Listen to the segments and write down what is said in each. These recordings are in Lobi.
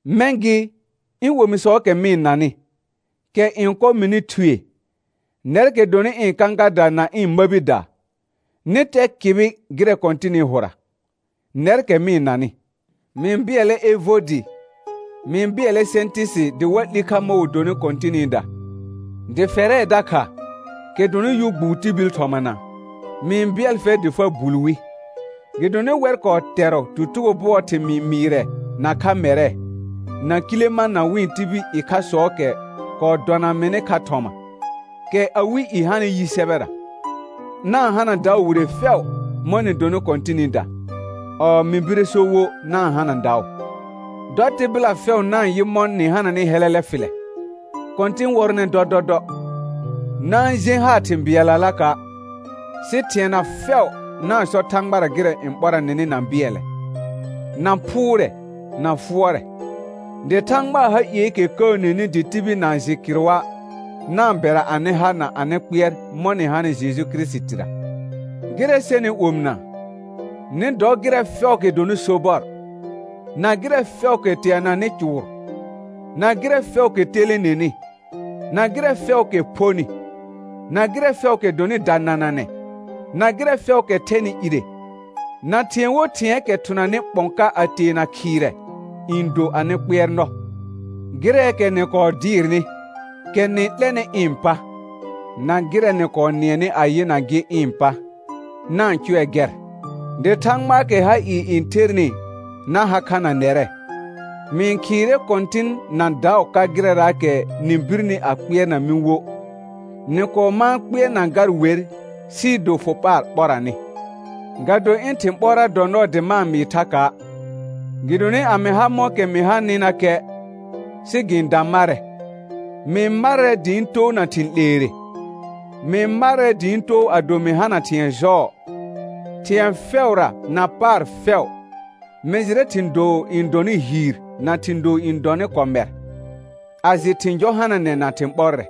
Mɛ̃ gɩ, ɩ̃ omisɔɔkɛ mɩ-n nanɩ, kɛ n kɔ mɩnɩ thue, nɛrkɛ dɔnɩ ɩ̃ kãkada na ɩ̃ məbida, nɩ tɛ kɩbɩ gɩrɛ Kɔ̃tɩnɩ hʋra, nɛrkɛ mɩ-n nanɩ. Mɩ-n bɩɛlɛ Evodɩ, mɩ-n bɩɛlɛ Sɛ̃tɩsɩ dɩ wa 'li kha mɔ̃ wɩ donɩ Kɔ̃tɩnɩda. Dɩ fɛrɛ dakha, kɛ dɔnɩ yʋ gbuu tibil thɔmana, mɩ-n bɩɛl fɛr dɩ fa bul wi, gɩdonɩ wɛr kɔɔ tɛrɔ tutugo bʋɔɔ thɩmɩɩ mɩɩrɛ nakha mɛrɛ, na Kilemã na wɩ̃ tibil ɩkhasɔɔkɛ kɔɔ dɔna mɩnɩ kha thɔma, kɛ awɩ i hanɩ yi sɛbɛra. Na-n hana daʋ wire fɛʋ mɔ̃ nɩ donɩ Kɔ̃tɩnɩda, ɔɔ mɩ bire so wo na-n hana daʋ. Dɔ tɩbɩla fɛʋ na-n yɩ mɔ̃ nɩ hananɩ hɛlɛlɛ fɩlɛ. Kɔ̃tɩn wɔrɔnɛ dɔdɔdɔ. Na-n jẽ haar thɩ̃ bɩɛllalaka', sɩ thɩɛna fɛʋ na-n sɔ Thãgbara gɩrɛ n ɓɔra nɩnɩ na bɩɛlɛ, na phʋʋrɛ, na fʋɔrɛ. Dɩ Thãgbaa ha ieekɛ kəəneni dɩ tibil na-n jɩ kɩrʋa', na-n bɛra anɩ ha na anɩ kpɩɛr mɔ̃ nɩ hanɩ Jeju Kirisitira. Gɩrɛ sɛnɩ omɩna, nɩ dɔ gɩrɛ fɛʋʋkɛ dɔnɩ sobɔr, na gɩrɛ fɛʋʋkɛ teananɩ cʋʋr, na gɩrɛ fɛʋʋkɛ telenenɩ, na gɩrɛ fɛʋʋkɛ phonɩ, na gɩrɛ fɛʋʋkɛ dɔnɩ danananɛ, na gɩrɛ fɛʋʋkɛ thɛnɩ ire, na thɩ̃ɛ wo thɩ̃ɛɛkɛ thʋnanɩ ɓɔ̃ ka a teena khɩirɛ, n do anɩ kpɩɛrnɔ. Gɩrɛɛkɛ nɩ kɔɔ dɩɩrnɩ, kɛ nɩ 'lɛnɩ ɩ̃ pa, na gɩrɛ nɩ kɔɔ nɩɛnɩ a yɩna gɩ ɩ̃ pa, na-n cʋɛ gɛr, dɩ Thãgbaakɛ ha ɩɩ n thernɩ na ha kha na nɛrɛ. Mɩ-n khɩɩrɛ Kɔ̃tɩn na daʋ ka gɩrɛraakɛ nɩ birni a kpɩɛrna mɩ wo. Nɩ kɔɔ mãa kpɩɛrna gar wer, sɩɩ do fʋ paar ɓɔra nɩ. Ga do ɩ̃ thɩ̃ ɓɔra dɔ nɔɔ dɩ ma-n mɩɩ thaka', gɩdonɩ a mɩ ha mɔ̃kɛ mɩ hanɩnakɛ, sɩ gɩ-n da marɛ. Mɩ-n marrɛ dɩ ɩ̃ too na thɩ̃ 'leere, mɩ-n marrɛ dɩ ɩ̃ too ado mɩ hana thɩ̃ɛ jɔɔ; thɩ̃ɛ fɛʋra na paar fɛʋ, mɩ jɩrɛ thɩ̃ doo n dɔnɩ hiir na thɩ̃ doo n dɔnɩ kɔmɛr, a jɩ thɩ̃ jɔ hananɛ na thɩ̃ ɓɔrɛ.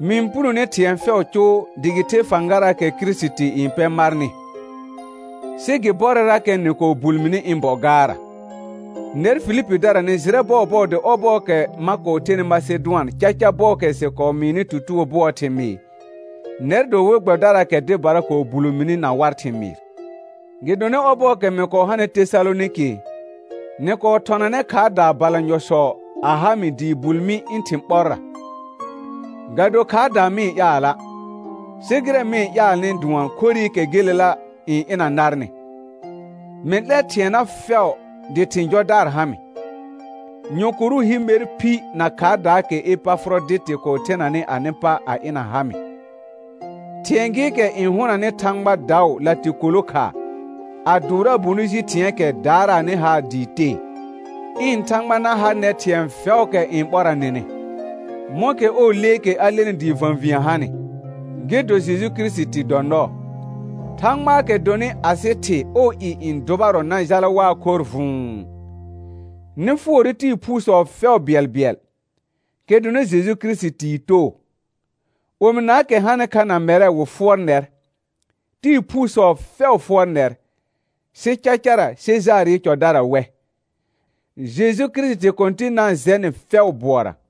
Mɩ-n punone thɩ̃ɛ fɛʋʋ cʋʋ dɩ gɩ the fãgaraakɛ Kirisiti n pɛ marnɩ; sɩ gɩ bɔrɛrakɛ nɩ kɔɔ bul mini ɩ̃ bɔ gaarra. Nɛr Filipidara nɩ jɩrɛ bɔɔbɔɔ dɩ ɔbɔɔkɛ ma kɔɔ thenɩ Masedʋan caca bɔɔkɛ sɩ kɔɔ mɩɩnɩ tutugo bʋɔɔ thɩmɩɩ, nɛr dɔ we gbɛbɩdaraakɛ dɩbara kɔɔ bulo mini na war thɩmɩɩr. Gɩdonɩ ɔbɔɔkɛ mɩ kɔɔ hanɩ Tesalonɩkɩ, nɩ kɔɔ thɔnanɛ khaardaa balanyɔsɔ a ha mɩ dɩɩ bul mi ɩ̃ thɩ̃ ɓɔrra. Ga do khaardaa mɩ-n ƴaala', sɩ gɩrɛ mɩ-n ƴaalnɩ dʋɔn khorɩkɛ gelela n ɩna narnɩ. Mɩ 'lɛr thɩɛna fɛʋ dɩ thɩ̃ jɔdaar ha mɩ, nyɔ̃korʋ hi mer phi na khaardaakɛ Epafʋrɔdɩtɩ kɔɔ thenanɩ anɩ pa a ɩna ha mɩ; thɩ̃ɛ gɩɩkɛ n hʋnanɩ Thãgba daʋ latɩkolo khaa, a dʋʋraa bonɩ ji thɩ̃ɛɛkɛ daaraanɩ haar dɩ tee. Ɩ̃ Thãgba na ha nɛr thɩ̃ɛ fɛʋʋkɛ n ɓɔra nɩnɩ, mɔ̃kɛ ɔɔ leekɛ a lenɩ dɩɩ və̃vĩə hanɩ, gɩ do Jeju Kirisiti dɔ nɔɔ. Thãgbaakɛ dɔnɩ asɩ Thɩ ɔɔ i n dʋbarɔ na jala waa khorr vʋ̃ʋ. Nɩ fʋɔrɛ tɩɩ phuusɔ fɛʋ bɩɛlbɩɛl, kɛ dɔnɩ Jeju Kirisitii too. Omɩnaakɛ hanɩ kha na mɛrɛ wɩ fʋɔr nɛr. Tɩɩ phuusɔ fɛʋ fʋɔr nɛr, sɩ cacara Sejaarɩ cɔdara wɛ. Jeju Kirisiti Kɔ̃tɩn na-n jɛ nɩ fɛʋ bʋɔra.